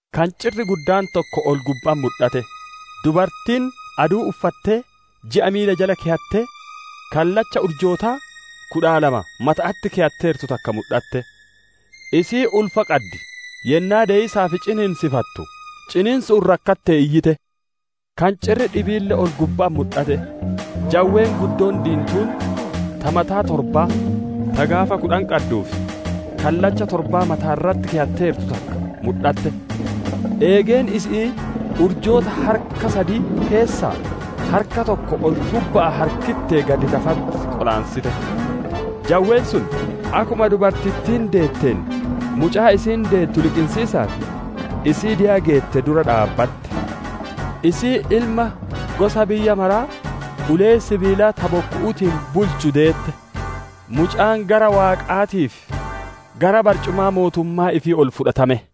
Kancirri guddaan tokko ol-gubba'atti mudhate; dubartiin aduu uffattee, ji'a miila jala keyattee, kallacha urjoota kudha lamaa mata'atti keyatteertu takka mudhatte. Isiin ulfa qaddi; yennaa deyiisaaf ciniinsifattu, ciniinsu'uun rakkattee iyyite. Kancirri dhibiille ol-gubba'atti mudhate; jawween guddoon diintuun, ta mataa torbaa, ta gaafa kudhan qadduu fi kallacha torba mata'atti keyatteertu takka mudhatte. Eegeen isi'ii urjoota harka sad keessaa harka tokko ol-gubba'aa harkittee gad lafatti qolaansite. Jawween sun, akkuma dubartittiin deetteen mucaa isiin deettu liqinsiisaaf, isii deya geette dura dhaabbatte. Isiin ilma gosa biyya maraa ulee sibiilaa ta bokku'uutiin bulchu deette; mucaan gara Waaqaatii fi gara barcumaa mootummaa ifii ol fudhatame.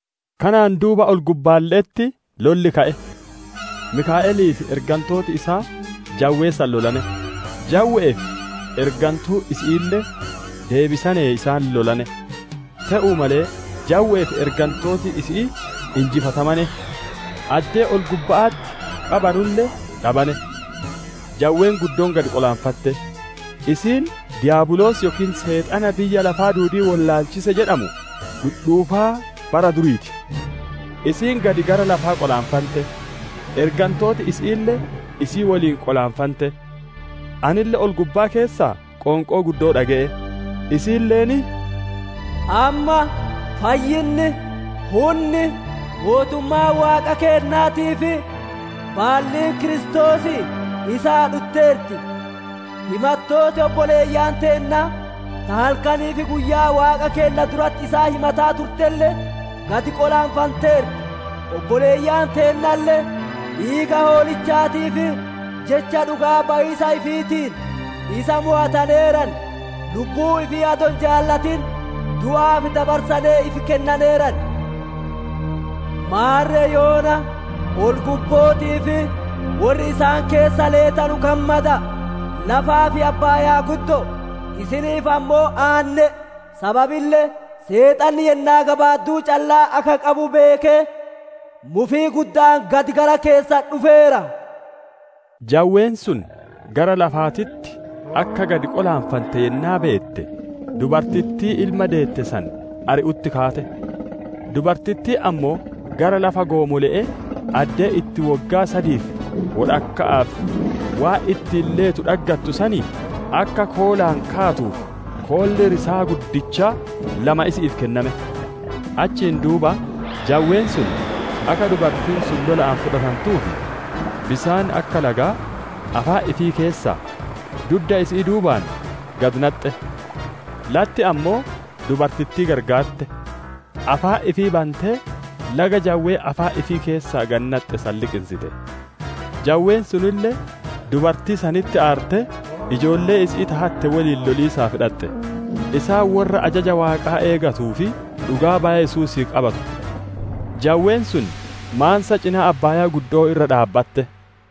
Kanaan duuba ol-gubbaalle'etti lolli ka'e. Mikaa'elii fi ergantooti isaa jawwee san lolane; jawwe'ee fi ergantuun isi'iille deebisane isaan lolane; te'uu malee jawwe'ee fi ergantooti isi'ii injifatamane; addee ol-gubba'atti qabanulle dhabane. Jawween guddoon gad qolaanfante; isiin Diyaabiloosii yookiin Seexana biyya lafaa duudii wollaalchise jedhamu, dhudhuufaa bara durii ti. Isiin gad gara lafaa qolaanfante; ergantooti isi'iille isii woliin qolaanfante. Anille ol-gubbaa keessaa qoonqoo guddoo dhage'e; isiilleen, «Amma fayyinni, hunni, mootummaan Waaqa keennaatii fi baalliin Kiristoosii isaa dhutteerti. Himattooti obboleeyyan teennaa, ta halkanii fi guyyaa Waaqa keenna duratti isaan himataa turtelle gad qolaanfanteerti. Obboleeyyan teennalle, dhiiga Hoolichaatii fi jecha dhugaa bayiisa ifiitiin isa mowataneeran; lubbuu ifii adoo hin jaalatin du'aaf dabarsanee ifi kennaneeran. Maarre yoona ol-gubbootii fi worri isaan keessa leetanu gammada'a! Lafaa fi abbaayaa guddo'o, isiniif ammoo aanne'e! Sababille Seexanni yennaa gabaadduu callaa akka qabu beekee, mufii gudda'aan gadi gara keessan dhufeera» jedhe. Jawween sun gara lafaatitti akka gad qolaanfante yennaa beette, dubartittii ilma deette san ari'utti kaate. Dubartittiin ammoo gara lafa goomole'ee, addee itti woggaa sadii fi wodhakka'aaf waan ittiin leetu dhaggattu sanii, akka koolaan kaatuuf koolli risaa guddichaa lama isi'iif kenname. Achiin duuba jawween sun akka dubartiin sun lola'aan fudhatantuuf, bisaan akka lagaa, afaan ifii keessaa, dudda isi'ii duubaan gadi naxxe. Latti ammoo dubartittii gargaarte; afaan ifii bantee laga jawween afaan ifii keessaa gadi naxxe san liqinsite. Jawween sunille dubartii sanitti aartee, ijoollee isi'ii ta hatte woliin loliisaaf dhaxxe; isaan worra ajaja Waaqaa eeggatuu fi dhugaa baya Yesuusii qabatu. Jawween sun maansa cinaa abbaaya'aa irra dhaabbatte.